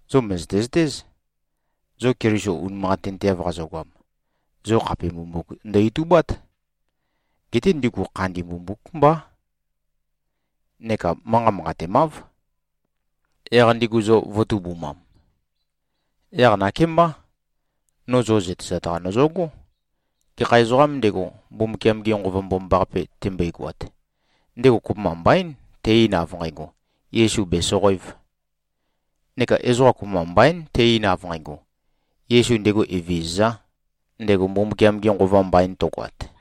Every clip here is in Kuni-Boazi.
Zo mø̀zøte-zøtéz, zo Keliso unimanqatinteav qazogoam, zo khape mbumbuk ndø-itubát. Geté ndigu khandi mbumbúk mbá, neka manqat manqatemáv. Yaq ndigu zo vø̄tubumam. Yaq nakémbá, no zo zøtezat-qa nøzøgó: Gekha ezoqām ndego, Mbumbukiam-ge Nqova Mbomambaqape tembøigoat, ndego kopømba mbaín, te-ein, av nqægo, “Yesu bèsoqoēv.” Neka ezoqa kopømba mbaín te-ein, av nqægo, “Yesu ndego Evezøzā,” ndego Mbumbukiam-ge Nqova mbain tøgoat.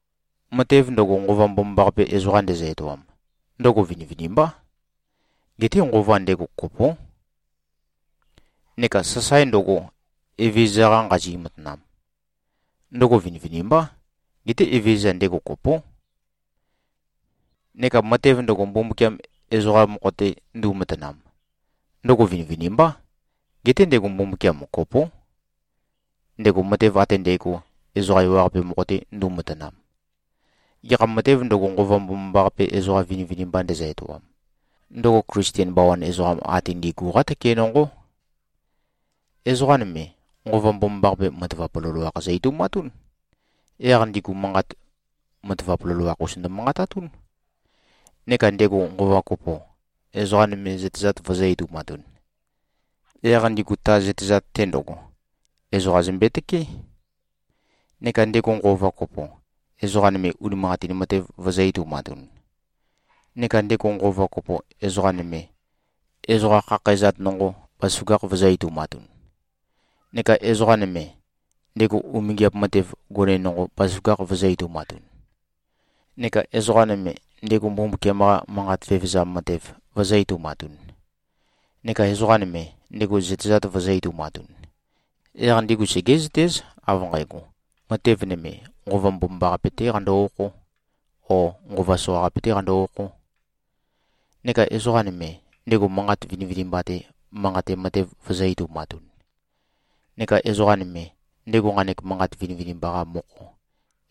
Matev ndøgo, Nqova Mbomambaqape ezoqa ndezø-etoam, ndøgo vinivinimbá. Geté Nqova ndego, kopó. Neka sasae ndøgo, Evezøza-qa nqazi-matanam, ndøgo vinivinimbá. Geté Evezøza, ndego kopó. Neka matev ndøgo, Mbumbukiam ezoqa mokho-te ndu꞉matanam, ndøgo vinivinimbá. Geté ndego Mbumbukiam kopó, ndego matev ate ndægo, ezoqa ewaqape mokho-te ndu꞉matanam. Gekha matēv ndøgo, Nqova Mbomambaqape ezoqa vinivinimba ndezø-etoam, ndøgo Klisten bawan ezoqam ate ndi꞉gu-qá tøke nonqó. Ezoqa nøme, Nqova Mbomambaqape matavap loloakh zø-etoumatún. Yaq ndigu manqat matavap loloakh-us ndømanqatatún. Neka ndego Nqova kopo, ezoqa nøme zøtezat vøzø̄-etoumatun. Yaq ndigu ta zøtezat-te ndøgo, ezoqa zømbe-tøkeé. Neka ndego Nqova kopo, ezoqa nøme unimanqatin matev vøzø̄-etoumatun. Neka ndego Nqova kopo, ezoqa nøme, ezoqa khakhæzat nonqo, bazaføgakh vøzø̄-etoumatun. Neka ezoqa nøme, ndego umingiap matev gone nonqo, bazaføgakh vøzø̄-etoumatun. Neka ezoqa nøme, ndego Mbumbukiam-qa manqat vevezam matev vøzø̄-etoumatun. Neka ezoqa nøme, ndego zøtezat vøzø̄-etoumatun. Yaq ndigu segé꞉zøtéz, av nqægo, matev nøme, Nqova Mbomambaqape-tē qando-okhō, ó, nqova soqaqape-tē qando-okhō. Neka ezoqa nøme, ndego manqat vinivinimba-te manqate matev vøzø̄-etoumatun. Neka ezoqa nøme, ndego nqanek manqat vinivinimba-qa mokho,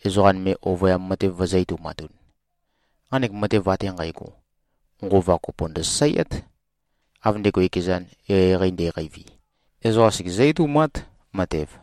ezoqa nøme oyøyam matev vøzø̄-etoumatun. Nqanek matev ate nqægo, Nqova kopo ndøsasaeát. Av ndego ekezan, eqeieqei nde꞉qeivi, ezoqa segezǿ-etoumát, matev.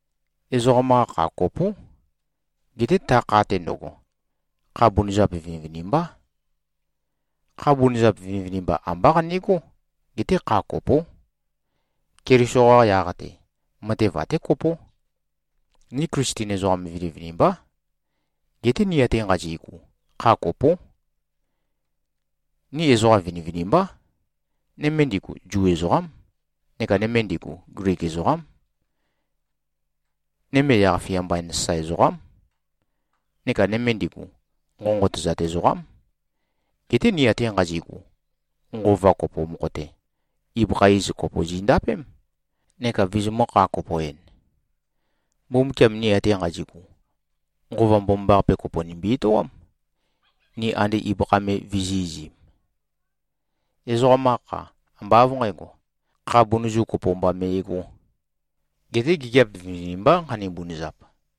Ezoqam-qa kha kopó. Geté ta kha-te ndøgo, kha bunøzap vinivinimbá. Kha bunøzap vinivinimba ambá qanegó, geté kha kopó. Keliso-qa yaq-te, matev até kopó. Ni Klisten ezoqam vinivinimbá. Geté ni ate nqazi꞉gu, kha kopó. Ni ezoqa vinivinimbá. Nøme ndigu Zu ezoqám, neka nøme ndigu Glik ezoqám. Nøme yaq-fia mbain sasae ezoqám, neka nøme ndigu, nqonqotøzat ezoqám. Geté ni ate nqazi꞉gu, Nqova kopo mokho-te, ibøkha iz kopo zi꞉ndapém, neka vizimø̄-kha-kopo-en. Mbumbukiam ni ate nqazi꞉gu, Nqova Mbomambaqape kopo nimbi-etoám, ni ande ibøkha me vizī꞉-izim. Ezoqam-qa kha, ambá av nqǣgo, kha bunøzu kopo mba me꞉gō. Geté gigiap vinivinimbá, nqani-bunøzap.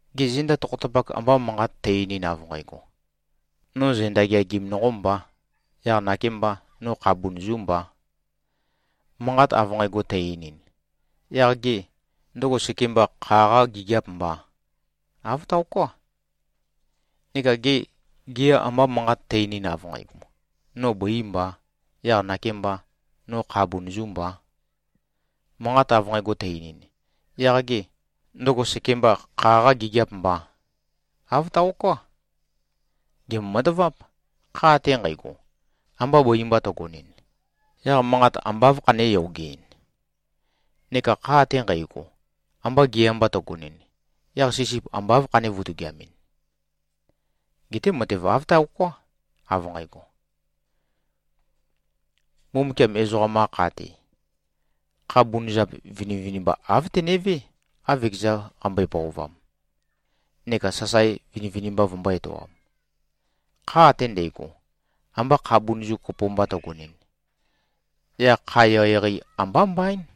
Gê, zenda tokhotapakh amba manqat tø-einin, av nqægo, “No zenda geagim nonqō mbā. Yaq nakēmbā, no kha bunøzū mbā.” Manqat av nqægo tø-einin, yaq gê, ndøgo sekemba kha-qâ gigiâp mbà? Āv taoká. Neka gê, gea amba manqat tø-einin, av nqægo, “No bøī mbā. Yaq nakēmbā, no kha bunøzū mbā.” Manqat av nqægo tø-einin, yaq gê, ndøgo sekemba kha-qâ gigiâp mbà? Āv taoká. Gèmbo-mataváp. Kha ate nqægo, amba bøi mba tøgonɨn, yaq manqat amba áv khané-yogeɨn? Neka kha ate nqægo, amba gea mba tøgonɨn, yaq sisip amba áv khané-vutugiamɨn? Geté matev āv taoká, av nqægo. Mbumbukiam ezoqam-qa kha-te, kha bunøzap vinivinimba āv tenevé, av ekeza qambøe-pøovam, neka sasae vinivinimba vømbō-etoam. Kha ate ndægo, amba kha bunøzu kopo mba tøgonɨn, yaq kha eqeieqei ambá mbaín.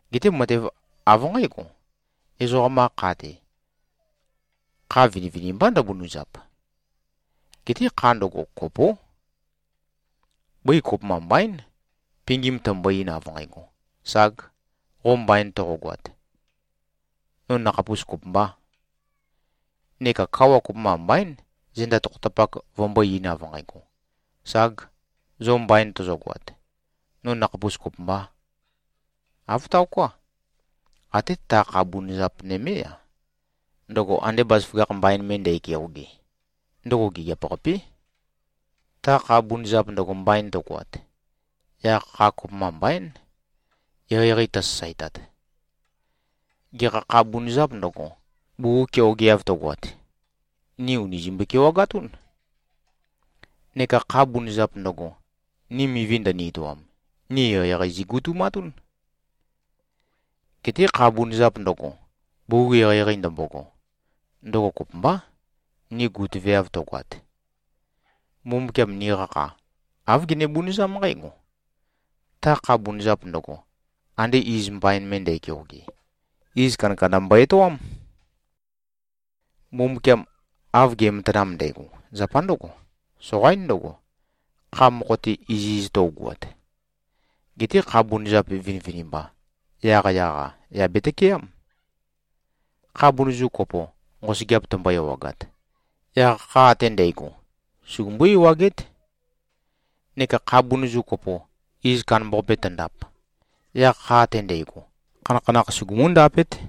Geté matev av nqǽgo: Ezoqam-qa kha-te, kha vinivinimbá ndøbunøzap. Geté kha ndøgo, kopó. Bøi kopømba mbaín, pingim tømbo-ein, av nqægo, “Ság, qo mbain toqogoat. No nøkhapus kopømbā.” Neka kawa kopømba mbaín, zenda tokhotapak vømbó-eīn, av nqægo, “Ság, zo mbain tozogoat. No nøkhapus kopømbā.” Āv taoká. Até ta kha bunøzap nømé-a, ndøgo ande bazaføgakh mbain me ndækeoge, ndøgo gigiap-qapé. Ta kha bunøzap ndøgo mbain tøgoat, yaq kha kopømba mbaín, eqeieqei tøsasaetat. Gekha kha bunøzāp ndøgo, bugug keogeav tøgoat, ni ùni zimbøe-kewagatún. Neka kha bunøzap ndøgo, ni mivi ndøni-etoam, ni eqeieqei zigutumatún. Geté kha bunøzap ndøgo, bugug eqeieqei ndømbogo, ndøgo kopømbá, ni gutøveav tøgoat. Mbumbukiam niqa kha, āv gene-bunøzám nqǽgo: Ta kha bunøzap ndøgo, ande iz mbain me ndækeoge, iz kandakanda mbo-etoám. Mbumbukiam av ge꞉matanam ndægo, zapa ndǿgo: Soqaín ndøgo, kha mokho-te iziz tøugoat. Geté kha bunøzap vinivinimba, yaqyaq-a yà betøkeám. Kha bunøzu kopo, nqosøgeap tømbo-ewagat, yaq kha ate ndægo, sugumbú-ewagét. Neka kha bunøzu kopo, iz kandambaqape tøndap, yaq kha ate ndægo, khanakhanakh sugumú-ndapét.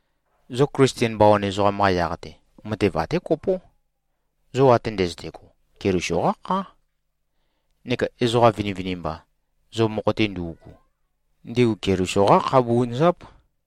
Zo Klisten bawan ezoqam-qa yaq-te, matev até kopó: Zo ate ndøzøte꞉go, Keliso-qá khá. Neka ezoqa vinivinimba, zo mokho-te ndu꞉gu, ndigu Keliso-qá kha bunøzáp.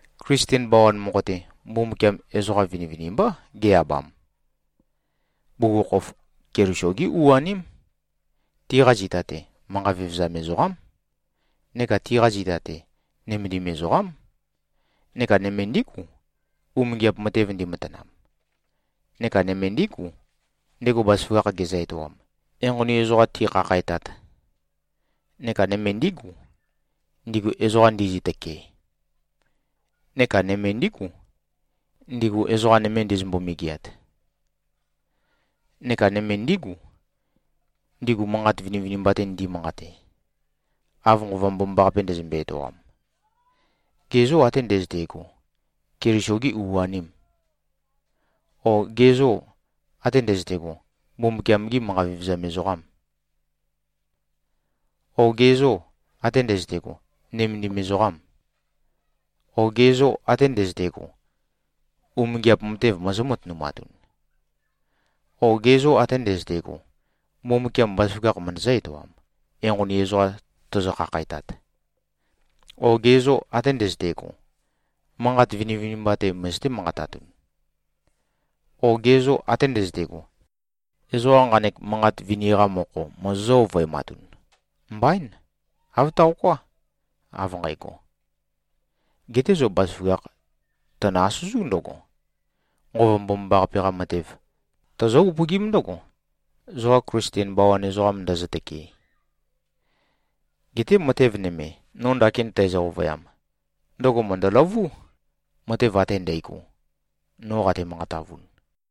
Klisten bawan mokho-te, Mbumbukiam ezoqam vinivinimbá ge-abam. Bugukhokhof Keliso-gí u-aním. Tiqa zita-te, manqa vevezam ezoqám. Neka tiqa zita-te, nømendim ezoqám. Neka nøme ndígu, umingiap matev ndimatanam. Neka nøme ndígu, ndego bazaføgakh gezø-etoam, enqoni ezoqa tikhakhætat. Neka nøme ndígu, ndigu ezoqa ndizø-tøkee. Neka nøme ndígu, ndigu ezoqa nøme ndizømbo-megeat. Neka nøme ndígu, ndigu manqat vinivinimba-te ndi꞉manqate, av Nqova Mbomambaqape ndezømbe-etoam. Ge zô, ate ndøzøte꞉go, Keliso-gî u-anìm? O ge zô, ate ndøzøte꞉go, Mbumbukiam-gî manqa vevezam ezoqàm? O ge zô, ate ndøzøte꞉go, nømendim ezoqâm? O ge zô, ate ndøzøte꞉go, umingiap matev mozó-matønumatun? O ge zô, ate ndøzøte꞉go, Mbumbukiam bazaføgakh møndøzǿ-etoam, enqoni ezoqa tozo-khakhætat? O ge zô, ate ndøzøte꞉go, manqat vinivinimba-te møzøté-manqatatun? O ge zô, ate ndøzøte꞉go, ezoqa nqanek manqat vini-qa mokho mozozǿ-ovøematun? Mbaín. Āv taoká, av nqægo. Geté zo bazaføgakh tønø-asøzú ndøgo: Nqova Mbomambaqape-qa matev, tozó-upøgím ndǿgo, zoqa Klisten bawan ezoqam ndøzø-tøkee. Geté matev nøme, no ndakin tæzø-ovøyam, ndøgo mø̀ndøløvú, matev ate ndægo, no qate-manqatavun.